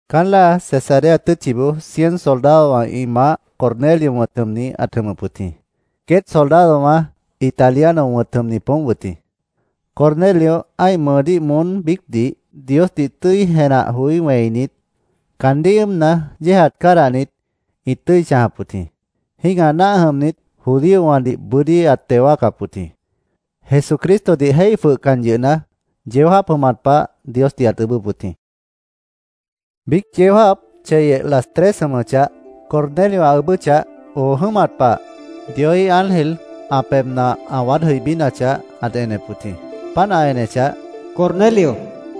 Caán láa Cesarea tʉ́tchiboó cien soldadowã ĩ maáh Cornelio wʉ̃t jʉmni ãt jʉmʉp wʉt jĩ. Queét soldadowã Italiano wʉ̃t jʉmni poómp wʉt jĩ. Cornelio ã́ih mʉʉdíh moón biícdih Diosdih tʉ́i jenah joí wẽinit, caandíh ʉ́ʉmna, yéejat cádahnit, ĩt tʉ́i chãjap wʉt jĩ. Jĩ́gah náah jʉmnit judíowãdih bʉ́dí ãt teo wáacap wʉt jĩ. Jesucristodih jéih jwʉhcan yʉhna, yeó jáap jʉmat pah Diosdih ãt ʉʉ́bʉ́p wʉt jĩ. Biíc yeó jáap cheyeh las tres jʉmʉchah, Cornelio ã ʉʉ́bʉ́chah, oo jʉ́mat pah, Dioíh ángel ã pebhna ã waád jʉibínachah, ãt enep wʉt jĩ. Páant ã enechah, “Cornelio”, ãt niijíp wʉt jĩ.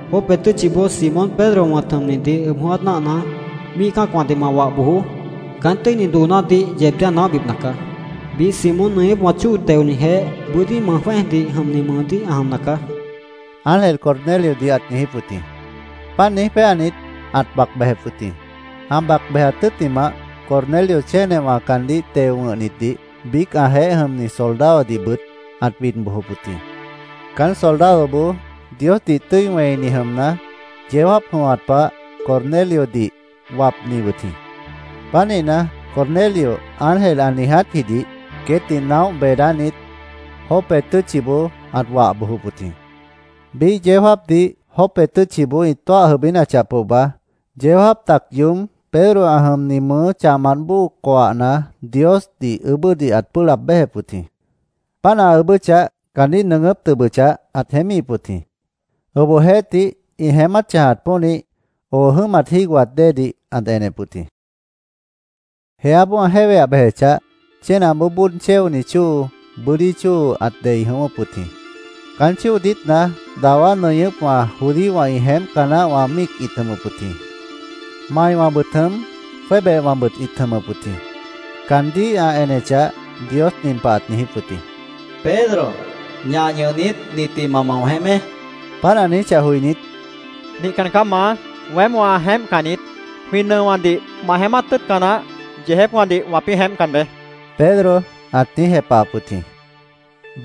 Jope tʉ́tchiboó Simón Pedro wʉ̃t jʉmnidih ʉb jʉ̃ʉ́wát náahna, míih cã́acwãdih ma wah bojoó. Caán tʉ́ini doonádih yeebdíh ã naóhbipna caá. Biíh Simón nʉñʉ́pwã chóo teonijeéh bʉ́dí mʉj jwẽ́ejdih jʉmni mʉʉdíh ã jʉmna caá”, ángel Corneliodih ãt niijíp wʉt jĩ. Páant niíj péanit, ãt bac bejep wʉt jĩ. Ã bac bejat tʉ́ttimah, Cornelio chénewã caandíh teo wʉ̃hnitdih, biíc ãjeéh jʉmni soldadodihbʉt ãt bid bojop wʉt jĩ. Caán soldadoboó Diosdih tʉ́i wẽini jʉmna, yeó jáap jʉmat pah Corneliodih wapni wʉt jĩ. Pánihna, Cornelio ángel ã niijátjidih queétdih naóh beedánit, Jope tʉ́tchiboó ãt wah bojop wʉt jĩ. Biíh yeó jáapdih Jope tʉ́tchiboó ĩ tóah jʉibínachah pohba, yeó jáap tac yoób Pedro ã jʉmni mʉʉ́ chahmant bóo coahna Diosdih ʉʉ́bʉ́dih ãt pʉ́ʉh laab béjep wʉt jĩ. Páant ã ʉʉ́bʉ́chah, caandíh nʉʉgʉ́p tʉbʉchah, ãt jeémíhip wʉt jĩ. Obohjeéhtih, ĩ jeémát chãjat pónih, oo jʉ́mat jígohat déedih ãt enep wʉt jĩ. Jeáboó ã jéweah bejechah, chénaboó bóod chéoni chóo, bʉ́dí chóo ãt dei jʉ̃ʉ́wʉ́p wʉt jĩ. Caán chóo diítna dawá nʉñʉ́pwã judíowã ĩ jeémpca naáhwã míic ĩt jʉmʉp wʉt jĩ. Maiwãbʉt jʉm, jwébehwãbʉt ĩt jʉmʉp wʉt jĩ. Caandíh ã enechah, Dios nin pah ãt niijíp wʉt jĩ: “Pedro, ñah ñʉhnit, nitdih ma mao jeémé”, ãt niijíp wʉt jĩ. Páant ã niijíchah joinít, “Nihcan caá, Maá. Weém wã jeémpcan niít. Jwĩ nʉowãdih ma jeémát tʉ́ʉtca naáh yeejépwãdih wãpĩ́ jeémpcan beé”, Pedro ãt niíj jepahap wʉt jĩ.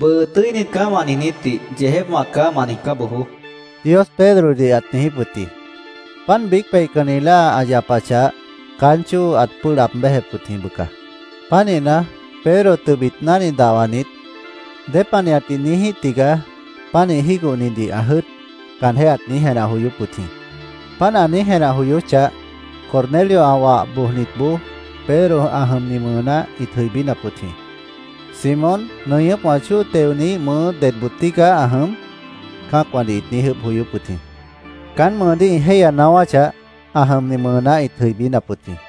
“ ‘Bʉʉ tʉ́init caá’, wã niijnítdih ‘Yeejépwã caá’, ma niijcá bojoó”, Dios Pedrodih ãt niijíp wʉt jĩ. Páant biíc peihcanni láa ã yapachah, caán chóo ãt pʉ́ʉh laab béjep wʉt jĩ, bʉca. Pánihna, Pedro tʉbit náhni dahwanit, “¿Dépanihatdih niíjíh tigaá pánih jígohnidih ã jʉ́ʉt?” caanjéh ãt niíj jenah joyóp wʉt jĩ. Páant ã niíj jenah joyóchah, Cornelio ã wah bojnitboó, Pedro ã jʉmni mʉʉná ĩt jʉibínap wʉt jĩ: “¿Simón nʉñʉ́pwã chóo teoniíh mʉʉ́ dedboo tígaá ã jʉm?” cã́acwãdih ĩt niíj ʉʉ́bh joyóp wʉt jĩ. Caán mʉʉdíh ĩ jéihya naáwáchah, ã jʉmni mʉʉná ĩt jʉibínap wʉt jĩ.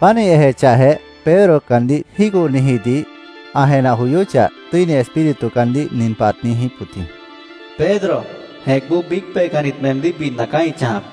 Páant ĩ ejechahjeh, Pedro caandíh jígohnijidih ã jenah joyóchah, Tʉ́ini Espíritu caandíh nin pah ãt niijíp wʉt jĩ: “Pedro, jẽcboó biíc peihcannit meemdíh bidna caá ĩ chãjap.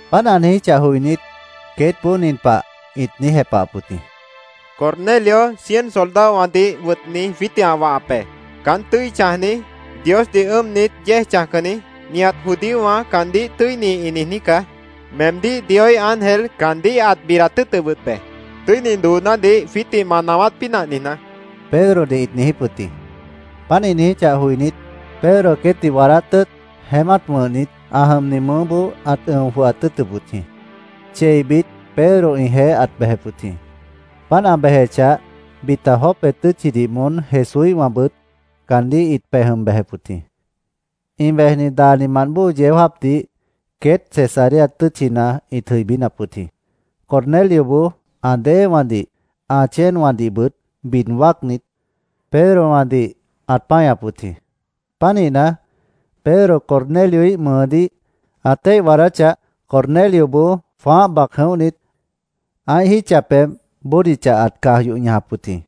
Páant ã niijíchah joinít, queétboó nin pah ĩt niíj jepahap wʉt jĩ: —Cornelio cien soldadowãdih wʉtni jwiítdih ã wahap be. Caán tʉ́i chãjni, Diosdih ʉ́ʉmnit yéej chãjcanni, nihat judíowã caandíh ‘Tʉ́ini’, ĩ niijní caá. Meemdíh Dioíh ángel caandíh ãt bidat tʉ́ʉtʉp wʉt be, tʉ́ini doonádih jwiítdih ma naáwát pínah niijná, Pedrodih ĩt niijíp wʉt jĩ. Páant ĩ niijíchah joinít, Pedro queétdih waadát tʉ́ʉt, jeémát wʉ̃hnit, ã jʉmni mʉʉ́boó ãt ʉ̃o jwʉhat tʉ́ʉtʉp wʉt jĩ. Cheibit Pedro ĩjeéh ãt bejep wʉt jĩ. Páant ã bejechah, bita Jope tʉ́tchidih moón Jesúíhwãbʉt caandíh ĩt pej jʉm bejep wʉt jĩ. Ĩ bejni daanimant bóo yeó jáapdih queét Cesarea tʉ́tchina ĩt jʉibínap wʉt jĩ. Cornelioboó ã déewãdih, ã chéenwãdihbʉt bid wáacnit, Pedrowãdih ãt páñap wʉt jĩ. Pánihna, Pedro Cornelioíh mʉʉdíh ã téih waadáchah, Cornelioboó jwãáh bac jʉ̃óhnit, ã́ih jítcha pebh bódicha ãt caj yoh ñajap wʉt jĩ.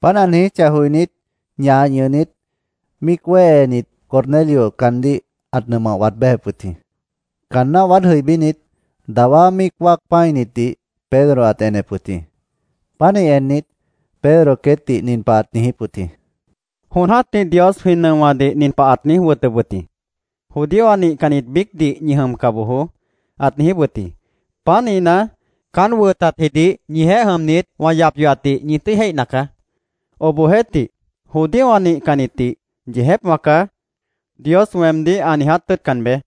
Páant ã niijíchah joinít, ñah ñʉhnit, míic wéhenit, Cornelio caandíh ãt nʉmah waad béjep wʉt jĩ. Caanná waád jʉibínit, dawá míic wáac pã́initdih Pedro ãt enep wʉt jĩ. Pánih ennit, Pedro queétdih nin pah ãt niijíp wʉt jĩ: —Jon jã́tih Dios jwĩ nʉowãdih nin pah ãt niíj wʉtʉp wʉt jĩ: ‘Judíowã nihcannit biícdih ñi jʉmca bojoó’, ãt niijíp wʉt jĩ. Pánihna, caán wʉtatjidih ñijeéh jʉmnit, wã yap yohatdih ñi tʉ́i jéihna caá. Obohjeéhtih, judíowã nihcannitdih ‘Yeejépwã caá’, Dios weemdíh ã niiját tʉ́ʉtcan beé.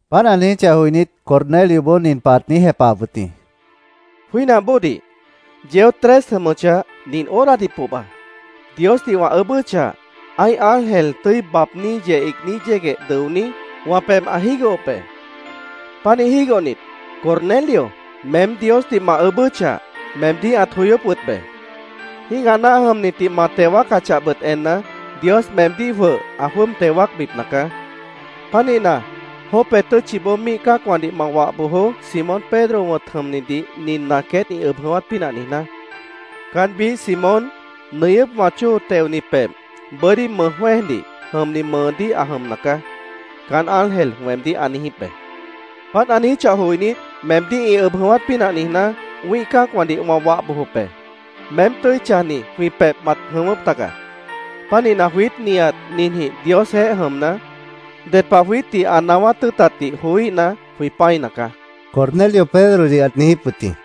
Páant ã niijíchah joinít, Cornelioboó nin pah ãt niíj jepahap wʉt jĩ: —Jwínah bóodih, yeó tres jʉmʉchah, nin horadih pohba, Diosdih wã ʉʉ́bʉ́chah, ã́ih ángel tʉ́i baabní yeh iigní yégueh dʉoní, wã pebh ã jígohop be. Pánih jígohnit, ‘Cornelio, meém Diosdih ma ʉʉ́bʉ́chah, meemdíh ãt joyóp wʉt be. Jĩ́gah náah jʉmnitdih ma teo wáacachahbʉt enna, Dios meemdíh jwʉh ã jwʉ́ʉb teo wáacbipna caá. Pánihna, Jope tʉ́tchiboó míih cã́acwãdih ma wah bojoó, Simón Pedro wʉ̃t jʉmnidih ninna queét ĩ ʉb jʉ̃ʉ́wát pínah niijná. Caán biíh Simón, nʉñʉ́pwã chóo teoni pebh, bʉ́dí mʉj jwẽ́ejdih jʉmni mʉʉdíh ã jʉmna caá’, caán ángel weemdíh ã niijíp be. Páant ã niijíchah joinít, meemdíh ĩ ʉb jʉ̃ʉ́wát pínah niijná, wĩ́ih cã́acwãdih wã wah bojop be. Meém tʉ́i chãjni jwĩ pebhna mat jʉ̃ʉ́wʉ́p tagaá. Pánihna, jwiít nihat ninjĩh Diosjeéh jʉmna, ded pah jwiítdih ã naáwát tʉ́ʉtatdih joííhna, jwĩ pã́ina caá, Cornelio Pedrodih ãt niijíp wʉt jĩ.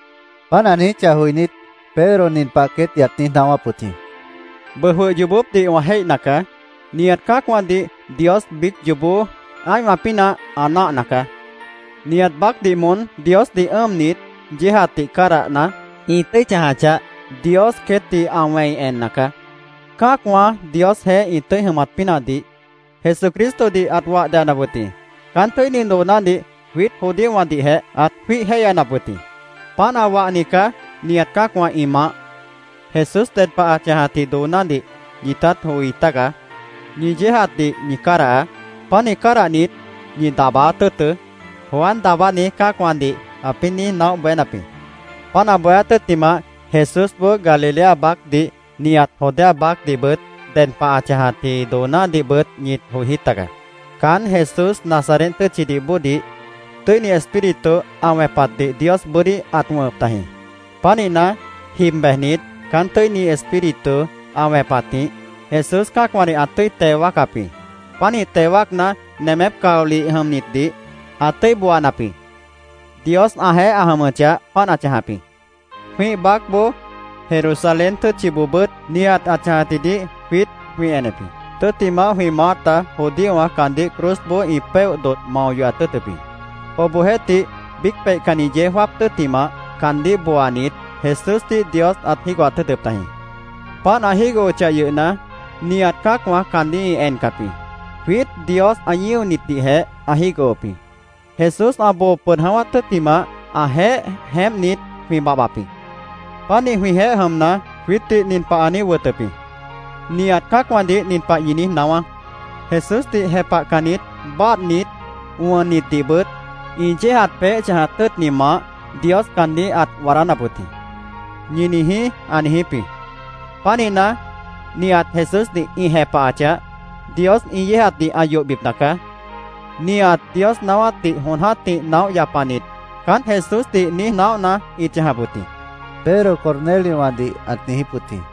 Páant ã niijíchah joinít, Pedro nin pah queétdih ãt niíj naáwáp wʉt jĩ: —Bʉʉ jwʉh yoobópdih wã jéihna caá. Nihat cã́acwãdih Dios biíc yoobó ã́ihwã pínah ã náahna caá. Nihat baácdih moón Diosdih ʉ́ʉmnit, yéejatdih cádahna, ĩ tʉ́i chãjachah, Dios queétdih ã wẽina caá. Cã́acwã Diosjeéh ĩ tʉ́i jʉmat pínahdih Jesucristodih ãt wah deyanap wʉt jĩ. Caán tʉ́ini doonádih jwiít judíowãdihjeh ãt jwíih jéihyanap wʉt jĩ. Páant ã wahni caá nihat cã́acwã ĩ maáh. Jesús ded pah ã chãjatji doonádih ñitát joi tágaá. ‘Ñi yéejatdih ñi cádahaá. Pánih cádahnit, ñi daabáát tʉ́ʉtʉ́’, Juan Daabáni cã́acwãdih ãpĩ́ niíj naóh bohénap jĩ. Páant ã bohéát tʉ́ttimah, Jesúsboó Galilea baácdih, nihat Judea baácdihbʉt ded pah ã chãjatji doonádihbʉt ñit joi tágaá. Caán Jesús Nazaret tʉ́tchidih bóodih Tʉ́ini Espíritu ã wẽpatdih Dios bʉ́dí ãt wʉ̃hʉp tajĩ. Pánihna, jib bejnit, caán Tʉ́ini Espíritu ã wẽpatjĩh Jesús cã́acwãdih ã tʉ́i teo wáacap jĩ. Pánih teo wáacna, nemép caolih jʉmnitdih ã tʉ́i booanap jĩ. Dios ãjeéh ã jʉmʉchah, páant ã chãjap jĩ. Jwĩ́ih baácboó Jerusalén tʉ́tchiboobʉ́t nihat ã chãjatjidih jwiít jwĩ enep jĩ. Tʉ́ttimah, jwĩ maáta judíowã caandíh cruzboó ĩ péoh dodh mao yohat tʉ́ʉtʉp jĩ. Obohjeéhtih biíc peihcanni yeó jáap tʉ́ttimah, caandíh booanit, Jesúsdih Dios ãt jígohat tʉ́ʉtʉp tajĩ. Páant ã jígohochah yʉhna, nihat cã́acwã caandíh ĩ encap jĩ. Jwiít Dios ã ñíonitdihjeh ã jígohop jĩ. Jesús ã boo pʉd jʉ̃ʉ́wát tʉ́ttimah, ãjeéh jeémpnit, jwĩ babhbap jĩ. Pánih jwĩjeéh jʉmna, jwiítdih nin pah ã niíj wʉtʉp jĩ: ‘Nihat cã́acwãdih nin pah ñi niíj naáwá: “Jesúsdih jepahcannit báadhnit, wʉnnitdihbʉt ĩ yéejat peéh chãjat tʉ́ʉtni maáh Dios caandíh ãt waadánap wʉt jĩ”, ñi niijí’, ã niijíp jĩ. Pánihna, nihat Jesúsdih ĩ jepahachah, Dios ĩ yéejatdih ã yohbipna caá. Nihat Dios naáwátdih jon jã́tih naóh yapanit caán Jesúsdih niíj naóhna ĩt chãjap wʉt jĩ, Pedro Corneliowãdih ãt niijíp wʉt jĩ.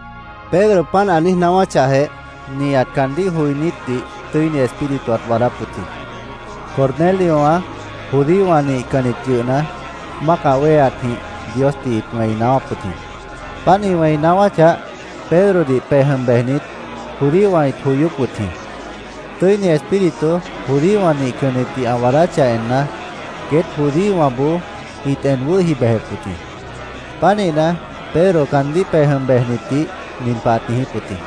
Pedro páant ã niíj naáwáchahjeh, nihat caandíh joinítdih Tʉ́ini Espíritu ãt waadáp wʉt jĩ. Corneliowã judíowã nihcannit yʉhna, mácah wéheatjĩh Diosdih ĩt wẽi naáwáp wʉt jĩ. Páant ĩ wẽi naáwáchah, Pedrodih pej jʉm bejnit judíowã ĩt joyóp wʉt jĩ. Tʉ́ini Espíritu judíowã nihcannitdih ã waadáchah enna, queét judíowãboó ĩt en wʉ́hi bejep wʉt jĩ. Pánihna, Pedro caandíh pej jʉm bejnitdih nin pah ãt niijíp wʉt jĩ: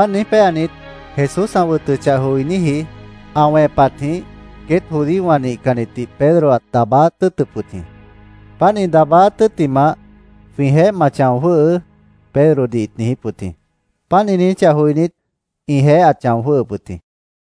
Páant niíj péanit, Jesús ã wʉtʉchah joiníji ã wẽpatjĩh queét judíowã nihcannitdih Pedro ãt daabáát tʉ́ʉtʉp wʉt jĩ. Páant ĩ daabáát tʉ́ttimah, “Jwĩjeéh ma chão jwʉ́hʉʉ́”, Pedrodih ĩt niijíp wʉt jĩ. Páant ĩ niijíchah joinít, ĩjeéh ãt chão jwʉ́ʉhʉp wʉt jĩ.